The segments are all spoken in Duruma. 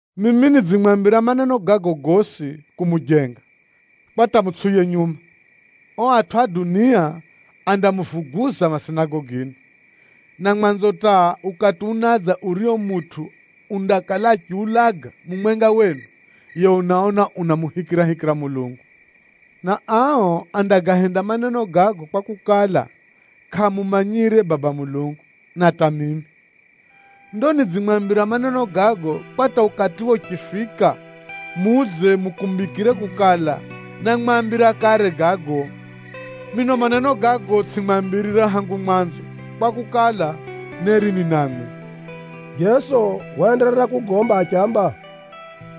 “Mimi nidzimwambira maneno gago gosi kumujenga, kwa hata mutsʼiuye nyuma. O atʼu a dunia andamuvuguza masinagogini. Na mwanzo hata ukati unadza urio mutʼu undakala uchiulaga mumwenga wenu, yiye unaona anamuhikirahikira Mulungu. Na ao andagahenda maneno gago kwakukala, kʼaamumanyire Baba Mulungu, na hata mimi. Ndo nidzimwambira maneno gago, kwa hata ukatiwe uchifika, mudze mukumbikire kukala, námwambira kare gago. Mino maneno gago tsʼimwambirire hangu mwanzo kwakukala, neri ni namwi.” Jeso waenderera kugomba achiamba,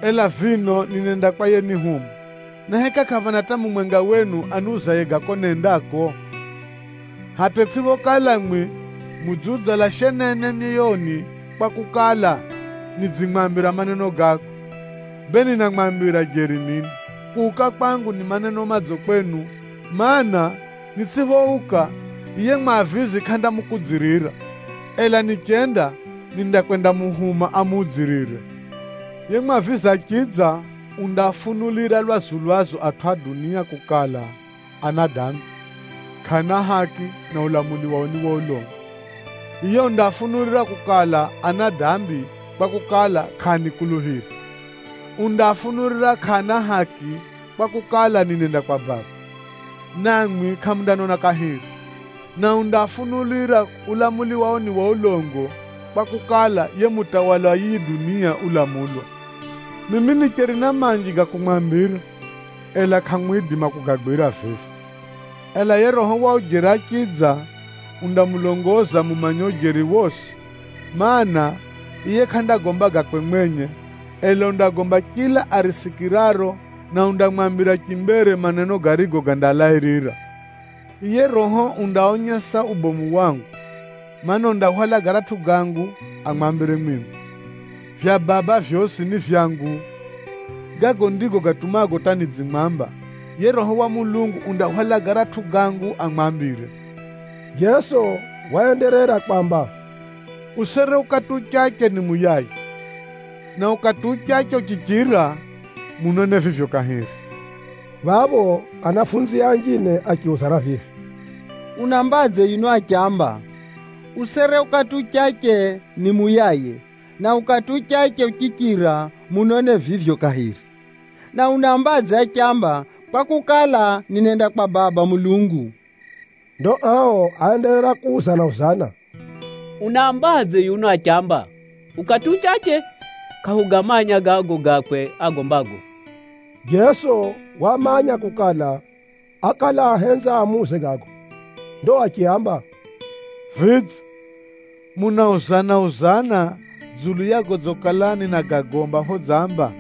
“Ela vino ninenda kwa yenihuma, na heka kʼaphana hata mumwenga wenu aniuzaye ga ko nendako? Hata itsʼiphokala mwi mudziudzala shenene myoyoni kwakukala, nidzimwambira maneno gago. “Bee ninamwambira jeri mino, kuuka kwangu ni maneno madzo kwenu, mana, nitsʼiphouka, yiye Mwavizi kʼandamukudzirira. Ela nichenda, nindakwendamuhuma amudzirire. Yiye Mwavizi achidza, undaafunulira lwazu-lwazu atʼu a dunia kukala, ana dambi, kʼaana haki na ulamuli wao ni wa ulongo. Yiye undaafunulira kukala, ana dambi, kwakukala, kʼaanikuluphira. Undaafunulira kʼaana haki, kwakukala, ninenda kwa Baba, namwi kʼamundanona kahiri. Na undaafunulira ulamuli wao ni wa ulongo, kwakukala, yiye mutawali wa yiyi dunia ulamulwa. “Mimi nicheri na manji ga kumwambira, ela kʼamwidima kugagwira vivi. Ela yiye Roho wa ujeri achidza, undamulongoza mumanye ujeri wosi, mana, yiye kʼandagomba gakwe mwenye, ela undagomba chila arisikiraro, na undamwambira chimbere maneno garigo gandalairira. Yiye Roho undaonyesa ubomu wangu, mana, undahwala garatʼu gangu amwambire mwimwi. Vya Baba vyosi ni vyangu. Gago ndigo gatumago hata nidzimwamba, yiye Roho wa Mulungu undahwala garatʼu gangu amwambire.” Jeso waenderera kwamba, “Usere ukati uchache nimuyaye, na ukati uchache uchichira, munone vivyo kahiri!” Phapho anafunzie anjine achiuzana vivi, “Unaambadze yuno achiamba, ‘Usere ukati uchache nimuyaye, na ukati uchache uchichira, munone vivyo kahiri!’? Na unaambadze achiamba, ‘kwakukala, ninenda kwa Baba Mulungu.’?” Ndo ao áenderera kuuzana-uzana, “Unaambadze yuno achiamba, ‘Ukati uchache’? Kʼahugamanya gago gakwe agombago.” Jeso wamanya kukala, ákala ahenza amuuze gago. Ndo achiaamba, “Vidze, munauzana-uzana dzulu ya godzikala ninagagomba phodzamba,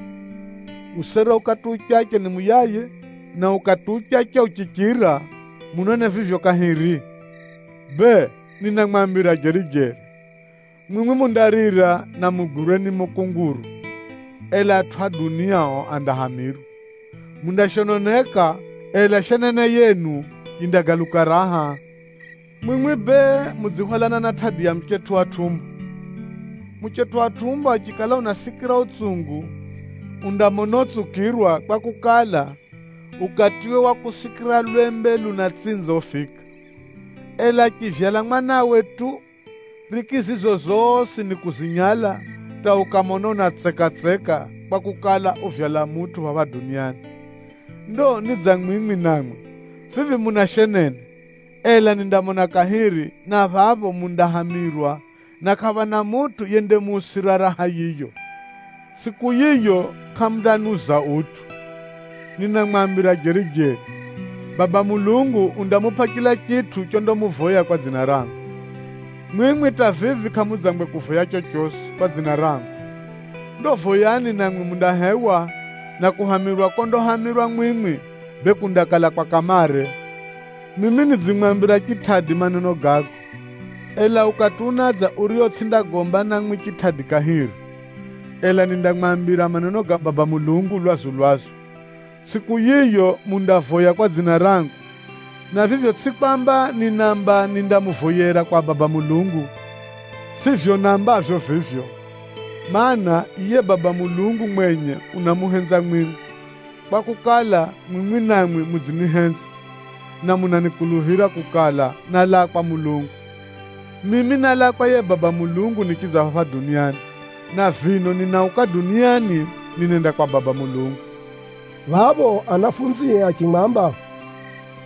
‘Usere ukati uchache nimuyaye, na ukati uchache uchichira, munone vivyo kahiri!’? Bee, ninamwambira jeri-jeri, mwimwi mundarira na mugwirwe ni mukunguru, ela atʼu a dunia o andahamirwa. Mundashononeka, ela shenene yenu yindagaluka raha. Mwimwi bee mudzihwalana na tʼadi ya muchetʼu wa tʼumbo. Muchetʼu wa tʼumbo achikala unasikira utsungu, undamona utsukirwa kwakukala, ukatiwe wa kusikira lwembe lunatsinza ufika. Ela achivyala mwanawe tu, riki zizo zosi nikuzinyala hata ukamona unatseka-tseka kwakukala, uvyala mutʼu phapha duniani. Ndo ni dza mwimwi namwi, vivi muna shenene. Ela nindamona kahiri, na phapho mundahamirwa, na kʼaphana mutʼu yendamuusira raha yiyo. Tsʼiku yiyo kʼamundaniuza utʼu. Ninamwambira jeri-jeri, Baba Mulungu undamupʼa chila chitʼu chondamuvoya kwa dzina rangu. Mwimwi hata vivi kʼamudzangwe kuvoya chochosi kwa dzina rangu. Ndo voyani namwi mundahewa, na kuhamirwa kondahamirwa mwimwi, bee kundakala kwa kamare. “Mimi nidzimwambira chitʼadi maneno gago. Ela ukati unadza urio tsʼindagomba namwi chitʼadi kahiri, ela nindamwambira maneno ga Baba Mulungu lwazu-lwazu. Tsʼiku yiyo, mundavoya kwa dzina rangu, na vivyo tsʼi kwamba ninaamba nindamuvoyera kwa Baba Mulungu. Tsʼivyo naambavyo vivyo, mana, yiye Baba Mulungu mwenye unamuhenza mwimwi, kwakukala, mwimwi namwi mudzinihenza, na munakuluphira kukala, nálaa kwa Mulungu. Mimi nálaa kwa yiye Baba Mulungu nichidza phapha duniani, na vino ninauka duniani ninenda kwa Baba Mulungu.” Phapho anafunzie achimwamba,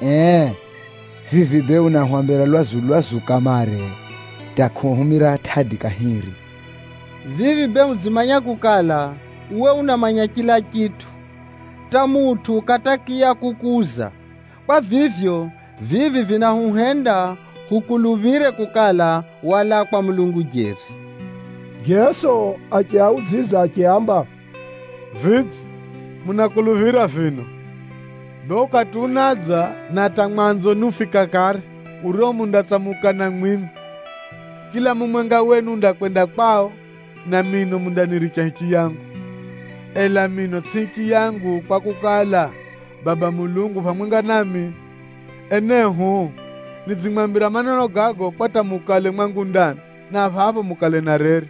“Ee, vivi bee unahwambira lwazu-lwazu kamare, hata kʼuhumira tʼadi kahiri. Vivi bee hudzimanya kukala, uwe unamanya chila chitʼu, hata mutʼu kʼatakiya kukuuza. Kwa vivyo, vivi vinahuhenda hukuluphire kukala, walaa kwa Mulungu jeri.” Jeso achiaudzidza achiaamba, “Vidze, munakuluphira vino? Bee ukati unadza, na hata mwanzo ni ufika kare, urio mundatsamukana mwimwi. Chila mumwenga wenu undakwenda kwao, na mino mundaniricha hichiyangu. Ela mino tsʼi hichiyangu kwakukala, Baba Mulungu u phamwenga nami. Enehu, nidzimwambira maneno gago, kwa hata mukale mwangu ndani, na phapho mukale na reri.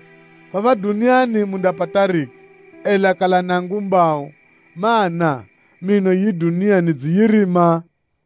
Phapha duniani mundapata riki, ela kalani angumbau, mana, mino yiyi dunia nidziyirima.”